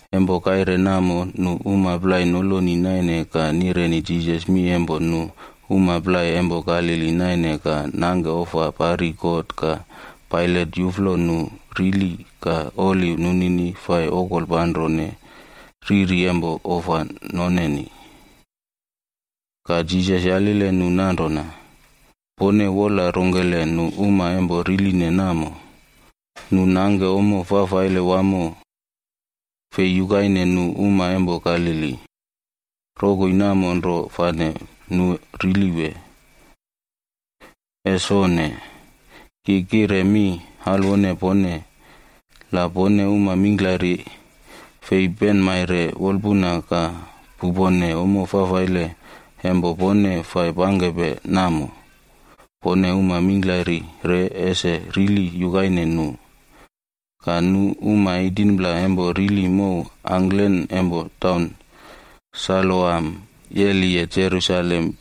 Empo kaire namo nu uma plai noloni naine ka nireni Jisas mi empo nu uma plai empo Galili naine ka nangke ofa pari God ka Pailat yuflo nu rili ka oli nunini fai okolpanrone riri empo ofa noneni. Ka Jisas yalile nu nanrona, “Pone wola rongkele nu uma empo riline namo, nu nangke nale fafaile wamo fei yukaine nu uma empo Galili, rokoi namo nro fane nu rili wee? Ese onne! Ki kire mi alwone pone. La pone uma mingklari fei penmaire wolpuna ka pupone ommo fafaile empo pone fai pangkepe namo, pone uma mingklari re ese rili yukaine nu. Ka nu uma 18pla empo rili mow angklen empo Saloam yeliye Jerusalem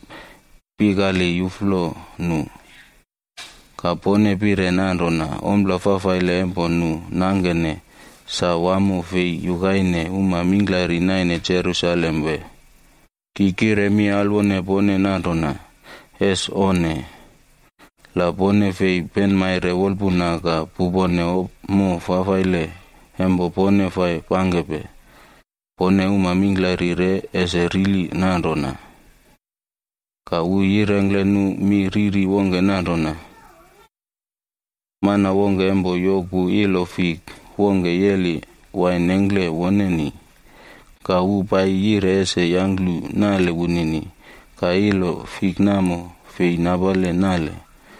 pikali yuflo nu. Ka pone pire nanrona ompla fafaile empo nu nangkene, sa wamo fei yukaine uma mingklari naine Jerusalem wee? Ki kire mi alwone pone nanrona, ese onne. La pone fei penmaire wolpuna ka pupone ommo fafaile empo pone fai pangkepe, pone uma mingklari re ese rili nanrona.” Ka wu yirengkle nu mi riri wongke nanrona, “Mana wongke empo yoku ilo fik wongke yeli wain nengkle woneni, ka wu paiyi yire ese yangklu nale wunini, ka wu fei yulu ilo fik namo fei napale nale plai.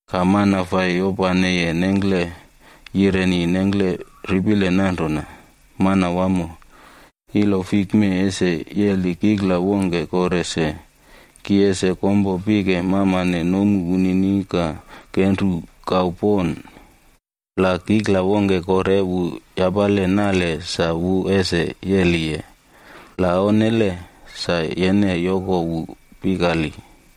“Ka mana fai yopaneye nengklele yireni nengkle ripile nanrona, ‘Manawamo, ilo fik mee ese yeli kikla wongke kore se. Ki ese kompo pike mamane nomu wunini ka kenru kau pon. La kikla wongke kore wu yapale nale sa wu ese yeliye, la onnele sa yene yoko wu pikali.’”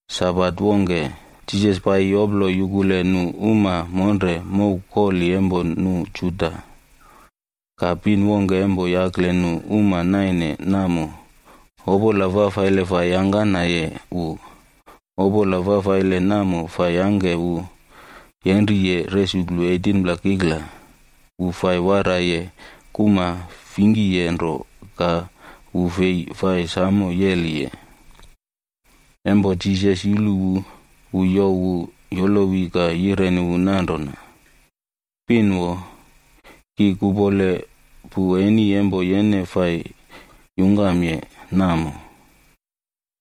Sabat wongke, Jisas paiyi yoplo yukule nu uma monre mow koli empo nu Juda. Ka pin wongke empo yakle nu uma naine namo, opola fafaile fai yangkanaye wu. Opola fafaile namo fai yangke wu yenriye resuklu 18pla kikla. Wu fai waraiye kuma fingkiye nro ka wu fei fai samo yeliye. Empo Jisas yulu wu, wu youw wu yolowi ka yireni wu nanrona, “Pin wo, ki kuꞌpole pu eni empo yene fai yungkamye namo.”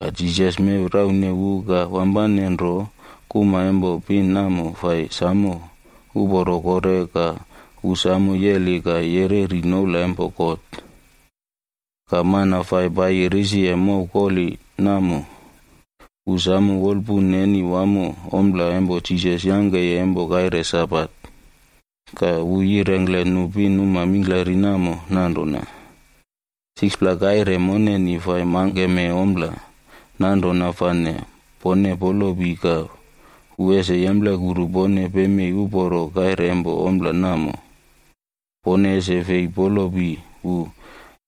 Ka Jisas mew raune wu ka wampane nro kuma empo pin namo fai samo uporo kore ka wu samo yeli ka yereri noula empo God. Ka mana fai paiyi risiye mow koli namo, wu samo wolpun neni wamo ompla empo Jisas yangkeye empo kaire Sabat. Ka wu yirengkle nu pinuma mingklari namo nanrona, “6pla kaire moneni fai mangkeme ompla, nanrona fane pone polopi ka wu ese yemplekuru pone pemei uporo kaire empo ompla namo. Pone ese fei polopi wu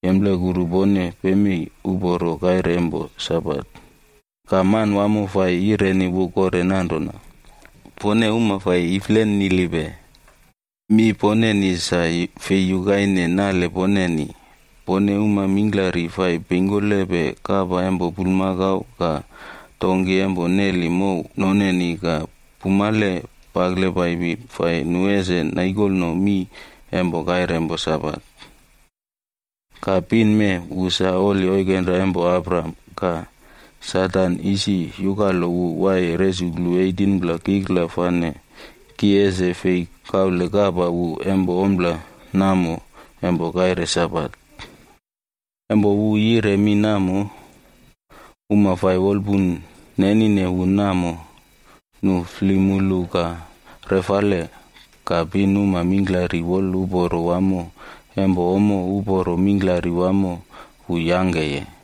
yemplekuru pone pemei uporo kaire empo Sabat.” Ka Manwamo fai yireni wu kore nanrona, “Pone uma fai iflenilipe! Mi poneni sa fei yukaine nale poneni. Pone uma mingklari fai peingkolepe kapa empo bulmakau ka donki empo neli mow noneni ka pumale pakle paipi fai nu ese naikolno mii empo kaire empo Sabat. Ka pin mee wu sa oli oikenra empo Abraham ka Satan isi yukalo wu waiye resuklu 18pla kikla fane ki ese fei kaule kapa wu empo ompla namo empo kaire Sabat?” Empo wu yire mi namo, uma fai wolpun nenine wu namo, nu flemulu ka refale. Ka pinuma mingklari woluporo wamo empo ommo uporo mingklari wamo wu yangkeye.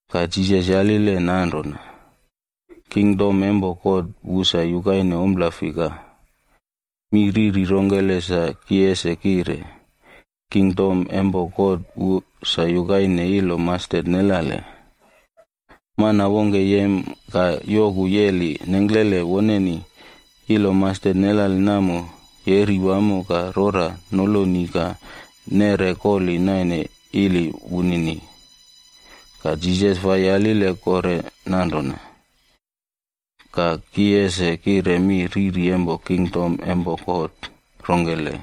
Ka Jisas yalile nanrona, “Kingdom empo God wu sa yukaine ompla fika? Mi riri rongkele sa ki ese kire? Kingdom empo God wu sa yukaine ilo mastet nelale, mana wongke yem ka yoku yeli nengklele woneni. Ilo mastet nelale namo yeri wamo ka rora noloni ka neꞌre koli naine ili wunini.” Ka Jisas fai yalile kore nanrona, “Ka ki ese kire mi riri empo kingdom empo God rongkele?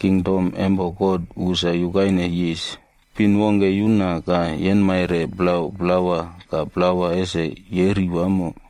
Kingdom empo God wu sa yukaine yis, pin wongke yuna ka yenmaire plau plawa ka plawa ese yeri wamo.”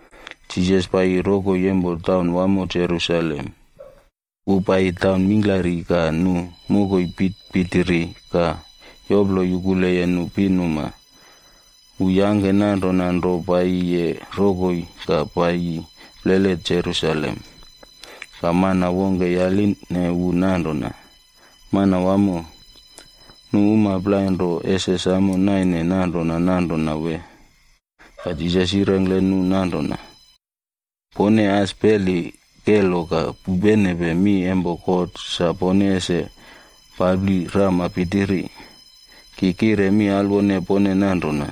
Jisas paiyi rokoi empo taun wamo Jerusalem. Wu paiyi taun mingklari ka nu mokoi pitpitiri ka yoplo yukuleye nu pinuma. Wu yangke nanrona nro paiyiye rokoi ka paiyi plele Jerusalem. Ka mana wongke yaline wu nanrona, “Manwamo, nu uma plai nro ese samo naine nanrona nanrona wee?” Ka Jisas yirengkle nu nanrona, “Pone as peli kelo ka pupenepe mi empo God sa pone ese papli rama pitiri. Ki kire mi alwone pone nanrona,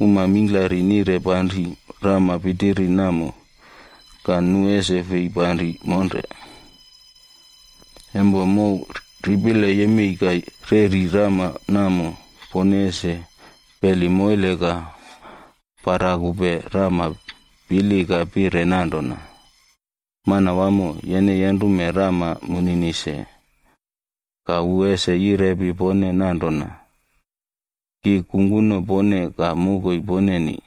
uma mingklari nire panri rama pitiri namo, ka nu ese fei panri monre. Empo mow ripile yemei ka reꞌri rama namo, pone ese peli moile ka parakupe rama pili ka pire nanrona, ‘Manwamo, yene yenrume rama munini se.’ “Ka wu ese yirepi pone nanrona, ‘Ki kungkuno pone ka mokoi poneni.’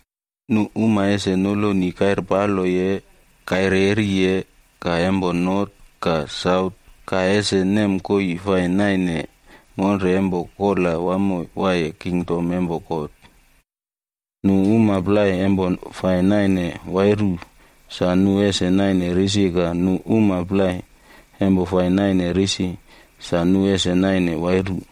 Nu uma ese noloni kairpaloye, kairyeriye, ka empo not ka saut ka ese nem koii fai naine monre empo kola wamo waiye kingdom empo God. Nu uma plai empo fai naine wairu sa nu ese naine risi ka nu uma plai empo fai naine risi sa nu ese naine wairu.”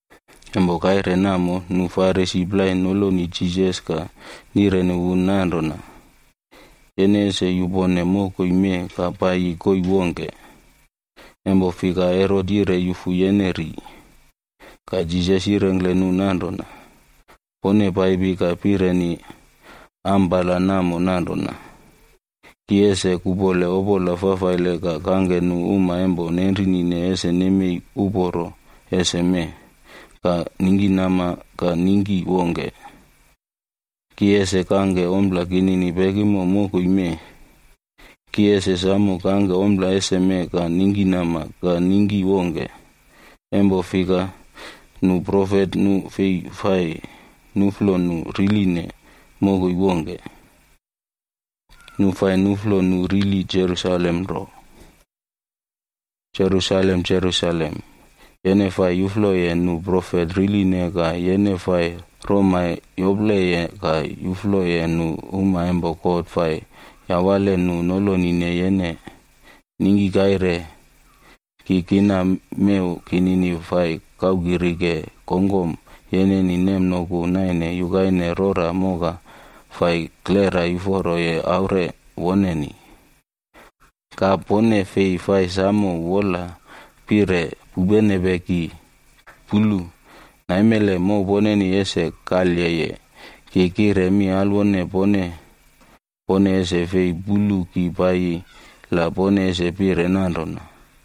Empo kaire namo, nu Farisi plai noloni Jisas ka nireni wu nanrona, “Yene ese yupone mokoi mee ka paiyi koii wongke, empo fika Herot yire yufu yene ri.” Ka Jisas yirengkle nu nanrona, “Pone paipi ka pireni ampala namo nanrona, ‘Ki ese kuꞌpole opola fafaile ka kangke nu uma empo nenrinine ese nemei uporo eseme ka ningkinama ka ningki wongke, ki ese kangke ompla kinini pekimo mokoi mee.’ Ki ese samo kangke ompla eseme ka ningkinama ka ningki wongke, empo fika nu profet nu fei fai nuꞌflo nu riline mokoi wongke, nu fai nuꞌflo nu riline Jerusalem nro. “Jerusalem! Jerusalem! Yene fai yufloye nu profet riline ka yene fai roma yopleye ka yufloye nu uma empo God fai yawale nu nolonine yene. Ningki kaire ki kina mew kinini fai kaukirike kongkom yeneni nemnoku naine yukaine rora moka fai klera yuforoye aure woneni. Ka pone fei fai samo wola pire pupenepe ki! Pulu! Naimele mow poneni ese kalyeye. Ki kire mi alwone pone, pone ese fei pulu ki paiyi la pone ese pire nanrona,